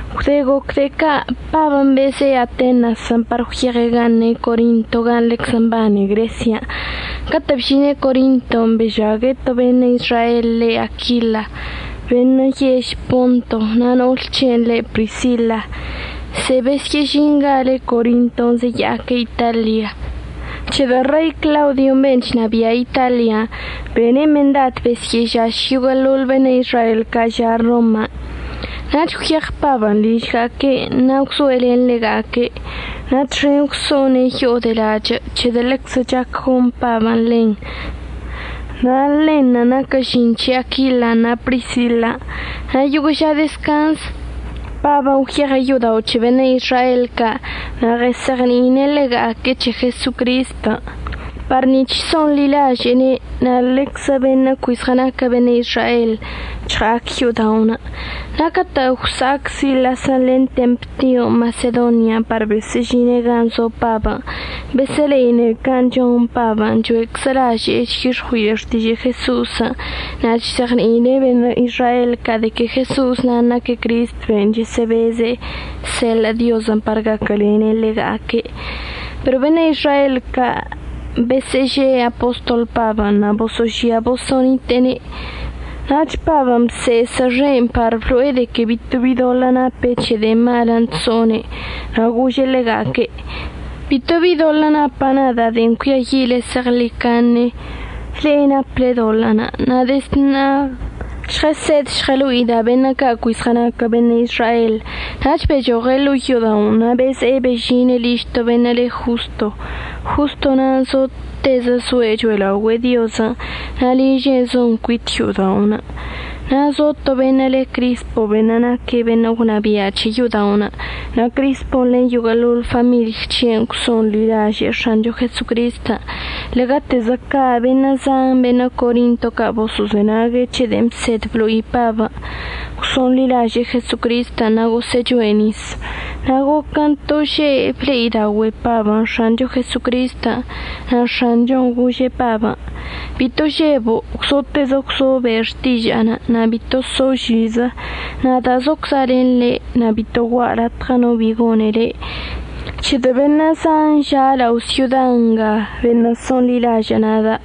Gwde goc de'e ca' Pabən' beze'e Atenasən' par gwyeɉe' gan' ne' Corinto gan' ḻeczə mbane Gresian'. Catə' bžine' Corinton' bežague' to beṉə' Izrael le Aquila beṉə' yež Ponto, na' no'ol c̱he'enə' le' Prisila. Ze'e besyə'əžingale' Corinton' zeya'aque' Italia, c̱hedə' Rei Claudion' ben' chnabia' Italian' bene' mendad besyə'əžaš yoguə'əḻoḻ beṉə' Izrael ca' ža' Roman'. Nach gwyeɉ Pabən' ližga'aque'enə' na' gwzoe' len ḻega'aque'. Na' txen gwso'one' yo'o de lachə' c̱hedə' ḻeczə chac gon Pabən' ḻen na' ḻenṉə' naquə žin c̱he Aquilan' na' Prisilan'. Na' yoguə' ža dezcanz Pabən' gwyeɉe' yo'odao' c̱he beṉə' Izrael ca' na' ɉəzeɉni'ine' ḻega'aque' c̱he Jesocristən' par nic̱h so'onḻilaže'ene' na' lenczə beṉə' cui zɉənaquə beṉə' Izrael chɉa'ac yo'oda'onə'. Na' catə' gwsa'ac Silasən' len Temtion' Masedonian' par besə'əžine' gan' zo Pabən' besə'əle'ine' can' chon Pabən' cho'eczə laže'e chyix̱ɉui'e xtižə' Jeso'osən' na' chzeɉni'ine' beṉə' Izrael ca' de que Jeso'osən' naque' Cristən' ben' chəsə'əbeze' əseḻə' Diozən' par gaquəlene' ḻega'aque'. Pero beṉə' Izrael ca' besə'əže'e apostol Pabən' na' boso'ožia boso'onite'ene'. Nach Pabən' bse'esə xe'enə' par blo'e de que bito bi doḻə' nape' c̱he de'e malən' chso'one', na' gože' ḻega'aque': ―Bito bi doḻə' napa' nada' de'en cuiayi'ile zeɉḻicaṉe. Le'e naple doḻə'ənə'. Na' dezd ṉa'a žɉəsed žɉəlo'ida' beṉə' ca' cui zɉənaquə beṉə' Izrael. Nach bechoɉe' ḻo'o yo'oda'onə' na' beze'e bežine' liž to beṉə' le Josto. Josto na'anə' zotezə zoe' cho'elaogüe'e Diozən' na' liže'enə' zon cuit yo'oda'onə'. Na' zo to beṉə' le Crispo beṉə' naquə beṉə' gwnabia' c̱he yo'oda'onə'. Na' Crispon' len yoguə'əḻoḻ famiḻy c̱he'enə' gwso'onḻilaže'e X̱ancho Jesocristən'. Ḻe'egatezə ca' beṉə' zan beṉə' Corinto ca' boso'ozenag c̱he de'en əbsed blo'i Pabən' gwso'onḻilaže'e Jesocristən' na' gosə'əchoe' nis. Na' goquən' to že' ble'idaogüe'e Pabən' X̱ancho Jesocristən', na' X̱anchon' gože' Pabən': ―Bito žebo'. Gwzotezə gwzo be' xtiža'anə' na' bito so' žizə. Nada' zocza' len le' na' bito gua'a latɉə no bi gone le', c̱hedə' beṉə' zan ža' lao' syoda nga beṉə' so'onḻilažə' nada'.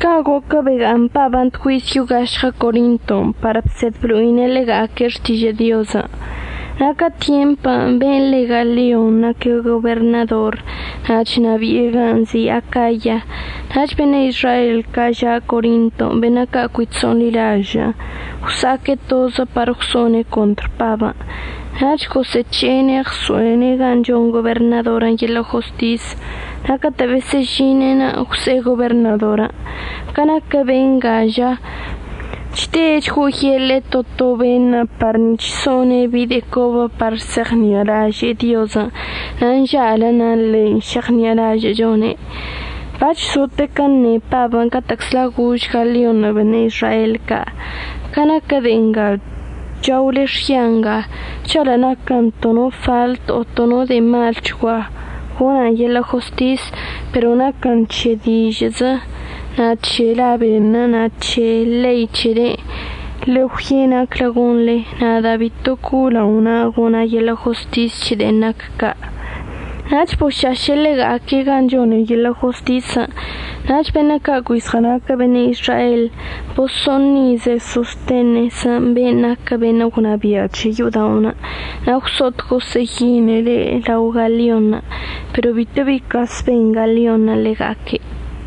Ca' goquən' bega'aṉ Pabən' tgüiz yo'o gašɉə Corinton' par bsed blo'ine' ḻega'aque' xtižə' Diozən'. Na' ca tyempən' be'enə' le Galion naque' goberṉador na' chnabi'e gan' nzi' Acaya. Nach beṉə' Izrael ca' ža' Corinton' beṉə' ca' cui chso'onḻilažə' gwsa'aque' tozə par gwso'one' contr Pabən'. Nach gosə'əc̱he'ene' ɉso'ene' gan' chon goberṉadorən' yeḻə' jostisən'. Na' catə' besə'əžine'enə' gwse'e goberṉadorən': ―Ca naquə benga ža, chde' chgo'oyeḻe'e to to beṉə' par nic̱h so'one' bi de'e cobə par se'eɉṉi'alaže'e Diozən' na' nža'alən' na ḻein' šeɉṉi'alažə'əchone'. Bac̱h zotequən' əṉe Pabən' catə'əczla gož Galionṉə' beṉə' Izrael ca': ―Ca naquə de'e nga chaole xya nga, žalə' naquən to no faḻt o to no de'e malchgua, gona'an yeḻə' jostis. Pero naquən c̱he dižə'əzə na' c̱he la beṉə' na' c̱he ḻei c̱helen'. Ḻe'e gwye' naclə gonḻe. Nada' bito co'o lao na'a gona' yeḻə' jostis c̱he de'en nac ca'. Nach bošaše' ḻega'aque' gan' chone' yeḻə' jostisən'. Nach beṉə' ca' cui zɉənaquə beṉə' Izrael boso'oṉize' Sostenesən' be'enə' naquə beṉə' gwnabia' c̱he yo'oda'onə'. Na' gwso'ot gosə'əyine' ḻe' lao Galionṉə' pero bito bi cas ben Galionṉə' ḻega'aque'.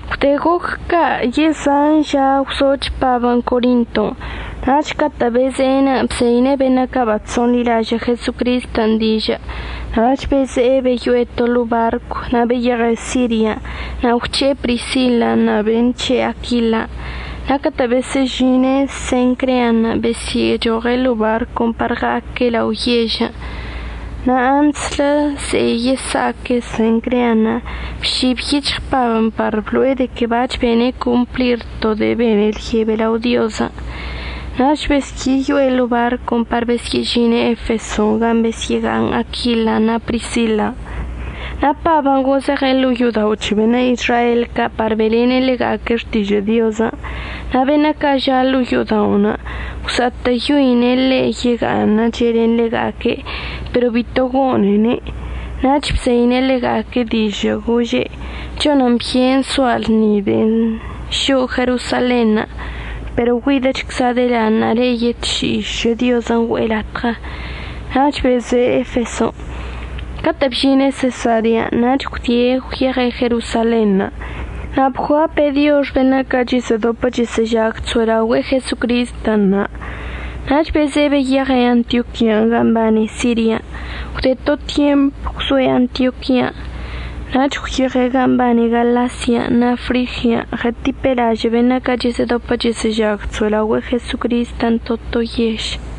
Gwde goc ca' yezan ža gwzoch Pabən' Corinton' nach catə' beze'enə' bzeine' beṉə' ca' bachso'onḻilažə' Jesocristən' dižə' nach beze'e beyo'e to ḻo'o barcw. Na' beyeɉe' Sirian' na' gwc̱he'e Prisilan' na' be'en c̱he' Aquilan'. Na' catə' besə'əžine' Sencrean' besyə'əchoɉe' ḻo'o barcon' par ɉa'aque' lao yežən'. Na' antslə ze'e yesa'aque' Sencrean' bšib yic̱hɉ Pabən' par blo'e de que bac̱h bene' complir to de'en bene' lyebe lao Diozən'. Nach besyə'əyo'e ḻo'o barcon' par besyə'əžine' Efeson' gan' besyə'əga'aṉ Aquilan' na' Prisilan'. Na' Pabən' gozeɉe' ḻo'o yo'odao' c̱he beṉə' Izrael ca' par be'elene' ḻega'aque' xtižə' Diozən'. Na' beṉə' ca' ža' ḻo'o yo'oda'onə' gwsa'atə'əyoine' ḻe' yega'aṉəche' len ḻega'aque', pero bito gone'ene'. Nach bzeine' ḻega'aque' dižə' gože': ―Chonən byen soa' lṉi de'en šo'o Jerosalenṉə', pero güidəchcza' delaṉa'a le'e yetši'i šə Diozən' güe'e latɉə. Nach beze'e Efeson'. Catə' bžine' Sesarean' nach gwdie' gwyeɉe' Jerosalenṉə' na' bguape' diox beṉə' ca' chəsə'ədopə chəsə'əžag chso'elaogüe'e Jesocristən' na', nach beze'e beyeɉe' Antioquian' gan' mbane Sirian'. Gwde to tyemp gwzoe' Antioquian', nach gwyeɉe' gan' mbane Galasian' na' Frigian' ɉətipe' lažə' beṉə' ca' chəsə'ədopə chəsə'əžag chso'elao' Jesocristən' to to yež.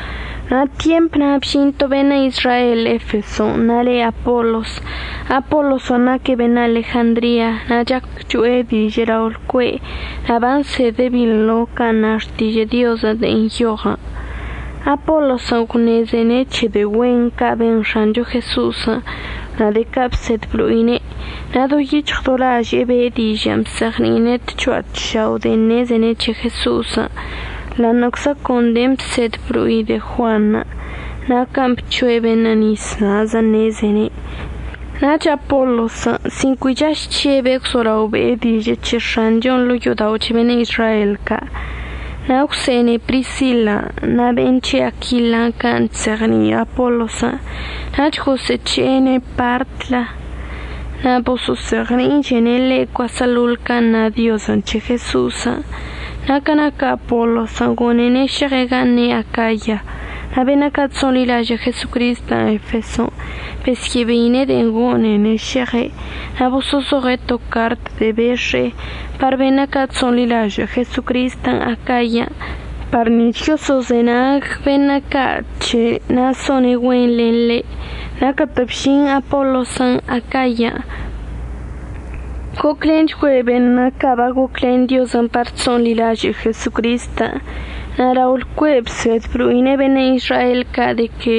Na' tyemp na' bžin to beṉə' Izrael Efeson' na' le' Apolos. Apolosən' naque' beṉə' Alejandria, na' chac cho'e dižə' lao' lcue' na' bansede' binḻo can' na xtižə' Diozən' de'en nyoɉən'. Apolosən' gwṉezene' c̱he de'e güen ca' ben X̱ancho Jeso'osən' na' de'e ca' bsed blo'ine'. Na' do yic̱hɉ do laže'e be'e dižə' bzeɉni'ine' tcho'a tšao' de'en ṉezene' c̱he Jeso'osən' ḻa'aṉə'əczə con de'en əbsed əblo'i de'e Juanṉə' na' can' bc̱hoe' beṉə' nis na'azən' ṉezene'. Nach Apolosən' sin cui chaž chžebe' gwzolao be'e dižə' c̱he X̱anchon' ḻo'o yo'odao' c̱he beṉə' Izrael ca'. Na' gwse'ene' Prisilan' na' be'en c̱he' Aquilan' can' chzeɉni'i Apolosən' nach gosə'əc̱he'e ḻe' partlə na' boso'ozeɉni'ichene' ḻe' cuaseḻoḻ can' na' Diozən' c̱he Jeso'osən'. Na' ca naquə Apolosən' gone'ene' šeɉe' gan' ne' Acaya, na' beṉə' ca' chso'onḻilažə' Jesocristən' Efeson' besyə'əbeine' de'en gone'ene' šeɉe' na' boso'ozoɉe' to cart de'e bex̱e'e par beṉə' ca' chso'onḻilaže'e Jesocristən' Acayan' par nic̱h yoso'ozenag beṉə' ca' c̱he' na' so'one' güen len ḻe'. Na' catə' bžin Apolosən' Acayan' goclenchgüe' beṉə' ca' bagoclen Diozən' par chso'onḻilaže'e Jesocristən'. Na' lao lcue' bsed blo'ine' beṉə' Izrael ca' de que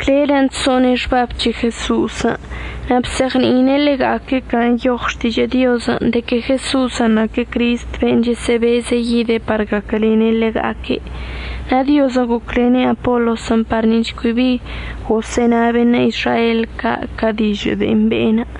clelən' chso'one' xbab c̱he Jeso'osən', na' bzeɉni'ine' ḻega'aque' can' nyoɉ Xtižə' Diozən' de que Jeso'osən' naque' Cristən' ben' chəsə'əbeze' yidə par gaquəlene' ḻega'aque'. Na' Diozən' goclene' Apolosən' par nic̱h cui bi gosə'əna beṉə' Izrael ca' ca dižə' de'en be'enə'.